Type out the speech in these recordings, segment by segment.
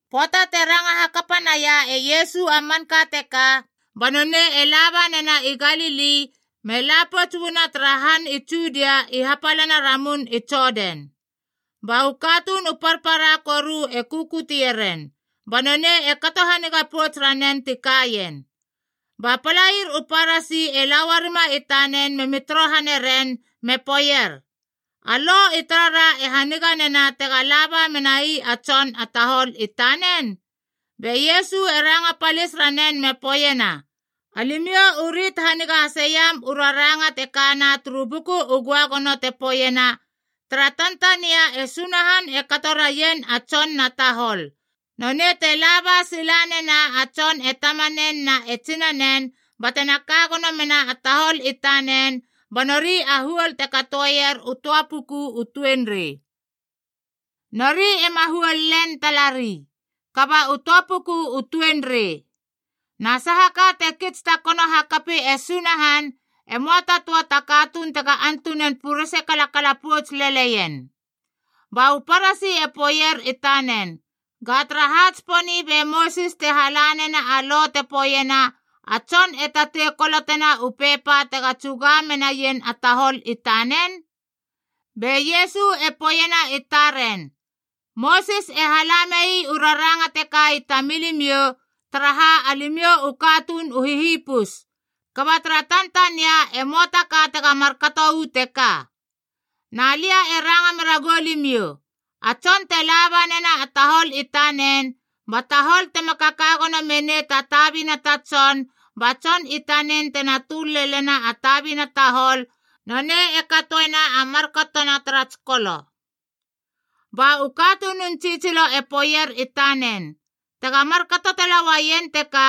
Pöata te ranga hakapa naia e Iesu a manka teka, ba nonei e laba nena i Galili me la pouts uana tara han i Judia i hapalana Ramun i Jodan. Ba u katuun u parpara koru e kukutie ren, ba nonei e kato haniga pouts ranen ti kaien. Ba palair u Parasi e la uarima i tanen memi torohane ren me poeier, “A Lo i tarara e haniganena tega laba menai a tson a tahol i tanen?” Be Iesu e ranga palis ranen me poeiena, “Alimiou u rit haniga haseiam u raranga te kana turu Buku u Göagono te poeiena, ‘tara tantania e Sunahan e kato raien a tson na tahol, Nonei te laba silanena a tson e tamanen na e tsinanen batena ka gono mena a tahol i tanen ba nori a huol te katoeier u töa puku u tuenrei.’ Nori ema huol len talari, kaba u töa puku u tuenrei. Na sahaka te kits takono hakapi e Sunahan, e möa ta töa ta katuun tega antunan purese kalakala pouts leleien.” Ba u Parasi e poeier i tanen, “Ga tara ha tsiponi be Mosis te hala nena a lo te poeiena a tson e tatei kolotena u pepa tega tsuga menaien a tahol i tanen?” Be Iesu e poeiena i taren, “Mosis e hala mei u raranga teka i tamilimiou, taraha alimiou u katuun u hihipus, kaba tara tantania e möa taka tega markato uu teka. Na lia e ranga mera goulimiou, a tson te laba nena a tahol i tanen, ba tahol tema kaka gono menei ta tabina ta tson, ba tson i tanen tena töl lelena a tabina tahol, nonei e katoena a markatona tara tsikolo.” Ba u katunun tsitsilo e poeier i tanen, “Tega markato tala uaien teka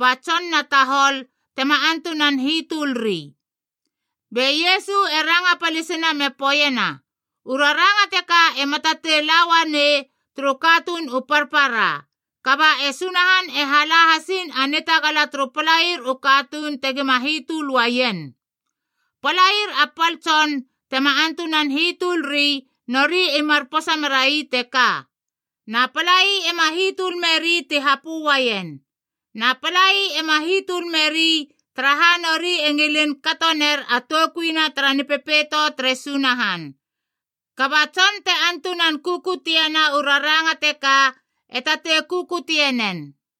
ba tson na tahol, tema antunan hitölri.” Be Iesu e ranga palisina me poeiena, “U raranga teka ema tatei la uanei turu katuun u parpara, kaba e Sunahan e hala hasiin a nitagala turu palair u katuun tegima hitöl uaien. Palair a pal tson tema antunan hitölri, nori i mar posa merai teka. Na palai ema hitöl meri ti hapö uaien. Na palai ema hitöl meri, taraha nori e ngilin kato ner a toukuina tara Nipepeito tere Sunahan. Kaba tson te antunan kukutiena u raranga teka, e tatei kukutie nen.”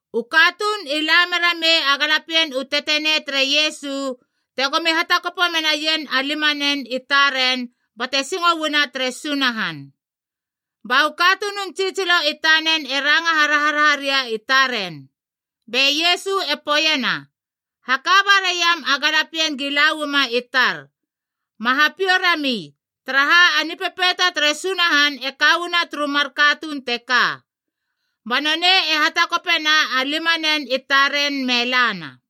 U katuun i la mera mei a galapien u tetenei tere Iesu, tegomi hatakopo menaien a limanen i taren bate singo uana tere Sunahan. Ba u katunun tsitsilo i tanen e ranga haraharaha ria i taren. Be Iesu e poeiena, “Haka baraiam a galapien gi la uama i tar, ma hapiou rami, taraha a Nipepeito tere Sunahan e ka uana turu mar katuun teka.” Ba nonei e hatakopena a limanen i taren me lana.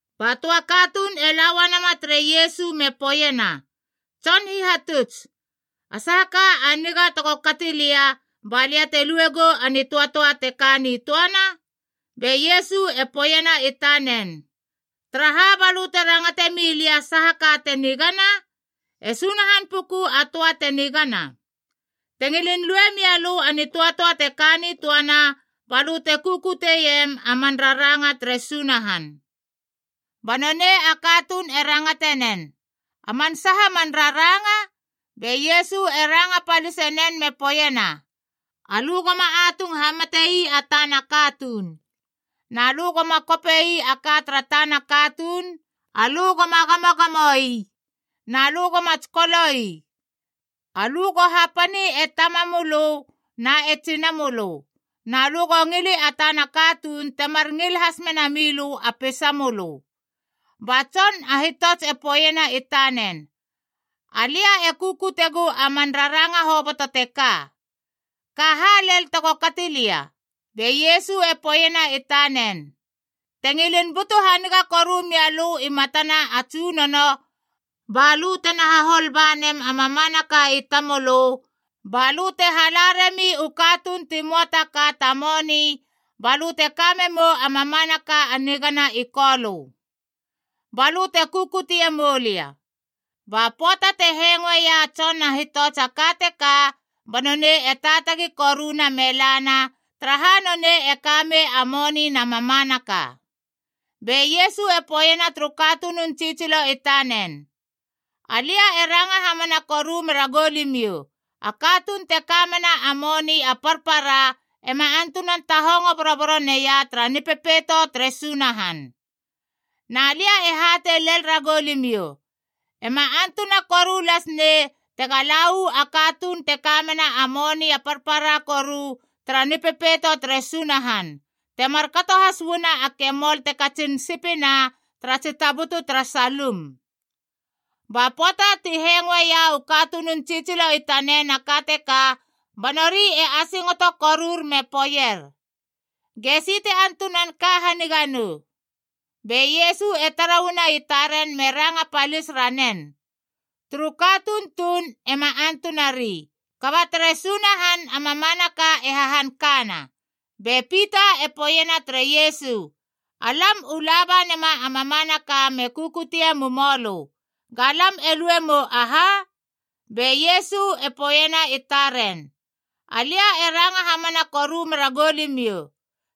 Ba töa katuun e la uanama tere Iesu me poeiena, “Tson Hihatuts, a saha ka a niga tego kati lia balia te luegou a nitöatöa te ka nitöana?” Be Iesu e poeiena i tanen, “Taraha balö te rangate milia saha ka te nigana? E Sunahan puku a töa te nigana. Te ngilin lue mialö a nitöatöa te ka nitöana, ba lö te kukutiem a man raranga tere Sunahan.” Ba nonei a katuun e rangatenen, “A man saha man raranga?” Be Iesu e ranga palisenen me poeiena, “Alö goma atung hamatei a tana katuun. Na lö goma kope ii a ka tara tana katuun. Alö goma gamogamoi. Na lö goma tsikolo ii. Alö go hapani e tamamölö na e tsinamölö. Na lö go ngili a tana katuun temar ngil hasmena milö a peisamölö.” Ba tson a hitots e poeiena i tanen, “Alia e kukutiegu a man raranga hoboto teka. Ka ha lel tego kati lia?” Be Iesu e poeiena i tanen, “Te ngilin butu haniga koru mia lö i matana a Tsunono, balö tena hahol ba nem a mamanaka i tamölö balö te hala rami u katuun ti möa ta ka ta moni, balö te kame mou a mamanaka a nigana i Kolö. Balö te kukutie moulia.” Ba pöata te hengoeia a tson a hitots a ka teka, ba nonei e taatagi koruna me lana, taraha nonei e kamei a moni na mamanaka. Be Iesu e poeiena turu katunun tsitsilo i tanen, “Alia e ranga hamana koru mera goulimiou, a katuun te kamena a moni a parpara ema antunan tahongo boroboro neia tara Nipepeito tere Sunahan. Na lia e hatei lel ragou limiou, ema antuna koru lasnei tega la uu a katuun te kamena a moni a parpara koru tara Nipepeito tere Sunahan, temar kato has uana a kemol te katsin sipina tara tsi tabutu tara salum.” Ba pöata ti hengoeia u katunun tsitsilo i tanen a ka teka, ba nori i asingoto korur me poeier, “Gesi te antunan ka haniga nou?” Be Iesu e tara uana i taren me ranga palis ranen, “Turu katuun tuun ema antunari, kaba tere Sunahan a mamanaka e hahankana.” Be Pita e poeiena tere Iesu, “Alam u laba nema a mamanaka me kukutie mumoulö. Ga lam e lue mou aha?” Be Iesu e poeiena i taren, “Alia e ranga hamana koru meragou limiou,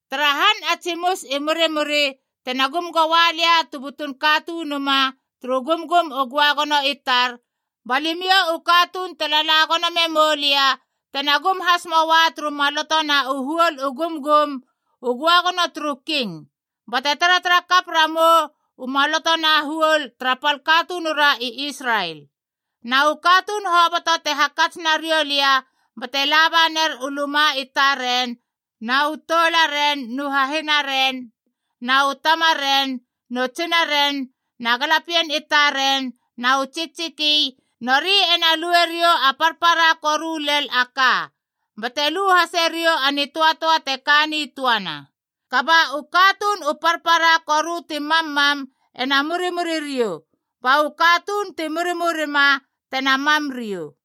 tara han a tsimus i murimuri, tena gum goa Lia tu butun Katunuma turu Gumgum u Göagono i tar, ba limiou u katuun te lala gono memou lia tena gum has moa turu maloto na u huol u gumgum u göagono turu king, bate taratarakap ramou u maloto na huol tara pal katunura i Israel. Na u katuun hoboto te hakats nariou lia bate labaner u luma i taren na u toularen nu hahinaren na u tamaren nu tsinaren, na galapien i taren na u tsiktsiki, nori ena lueriou a parpara koru lel a ka, bate lu hase riou a nitöatöa te ka nitöana. Kaba u katuun u parpara koru ti mammam ena murimuri riou, ba u katuun ti murimurima tena mam riou.”